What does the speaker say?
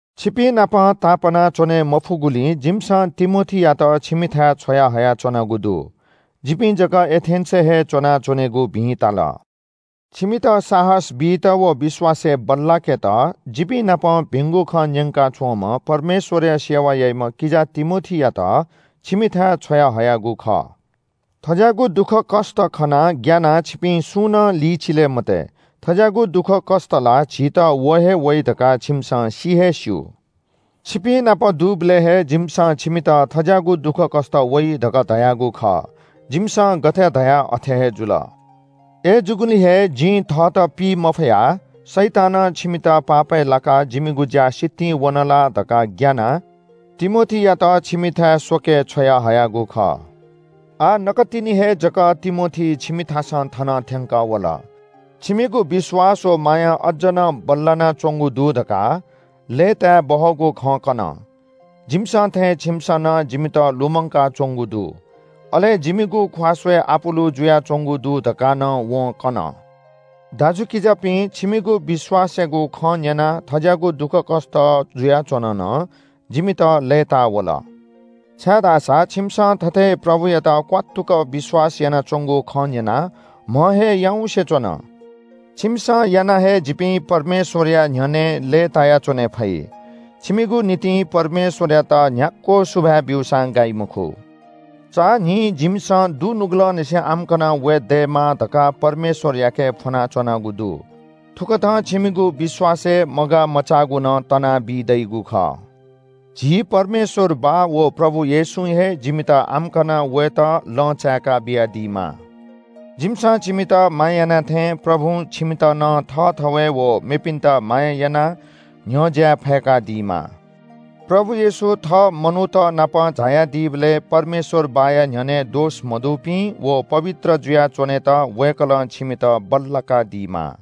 छिपिंनाप तापाना च्‍वने मफुगुलिं जिमिसं तिमोथीयात छिमिथाय् छ्वया हयाच्‍वनागु दु। जिपिं जक एथेन्‍सय् हे च्‍वनाच्‍वनेगु भिं ताल। छिमित साहस बीत व विश्‍वासय् बल्‍लाकेत जिपिं नाप भिंगु खँ न्‍यंका च्‍वंम्‍ह परमेश्‍वरया सेवा याइम्‍ह किजा तिमोथीयात छिमिथाय् छ्वयाहयागु खः। थज्‍याःगु दुःखकष्‍ट खनाः ग्‍यानाः छिपिं सुं नं लिचिले मते। थज्‍याःगु दुःखकष्‍ट ला झीत व हे वइ धकाः छिमिसं सि हे स्‍यू। छिपिंनाप दुबलय् हे जिमिसं छिमित थज्‍याःगु दुःखकष्‍ट वइ धकाः धयागु खः। जिमिसं गथे धया अथे हे जुल। अय्‌जूगुलिं हे जिं थःत पी मफयाः शैतानं छिमित पापय् लाकाः जिमिगु ज्‍या सितिं वन ला धकाः ग्‍यानाः तिमोथीयात छिमिथाय् स्‍वके छ्वयाहयागु खः। आः नकतिनि हे जक तिमोथी छिमिथासं थन थ्‍यंकः वल। छिमिगु विश्‍वास व माया अज्‍ज नं बल्‍लानाच्‍वंगु दु धकाः लय्‌ताय् बहःगु खँ कन। जिमिसं थें छिमिसं नं जिमित लुमंकाच्‍वंगु दु, अले जिमिगु ख्‍वाः स्‍वये आपुलु जुयाच्‍वंगु दु धकाः नं वं कन। दाजुकिजापिं, छिमिगु विश्‍वासयागु खँ न्‍यनाः थज्‍याःगु दुःखकष्‍ट जुयाच्‍वन नं जिमित लय्‌ताः वल। छाय्‌धाःसा छिमिसं थथे प्रभुयात क्‍वात्तुक विश्‍वास यानाच्‍वंगु खँ न्‍यनाः म्‍ह हे याउँसे च्‍वन। छिमिसं यानाः हे जिपिं परमेश्‍वरया न्‍ह्यःने लय्‌तायाच्‍वने फइ। छिमिगु निंतिं परमेश्‍वरयात न्‍ह्याक्‍व सुभाय् ब्‍यूसां गाइ मखु। चान्‍हिं जिमिसं दुनुगलंनिसें आम्‍कन वये दयेमा धकाः परमेश्‍वरयाके फ्‍वनाच्‍वनागु दु। थुकथं छिमिगु विश्‍वासय् मगाः मचाःगु नं तना बीदइगु खः। झी परमेश्‍वर बाः व प्रभु येशूं हे जिमित आम्‍कन वयेत लँ चाय्‌का बियादीमा। जिमिसं छिमित माया याना थें प्रभुं छिमित नं थःथवय् व मेपिन्‍त माया यानाः न्‍ह्यज्‍याये फय्‌कादीमा। प्रभु येशू थः मनूत नाप झायादीबलय् परमेश्‍वर बाःया न्‍ह्यःने दोष मदुपिं व पवित्र जुया च्‍वनेत वय्‌कलं छिमित बल्‍लाकादीमा।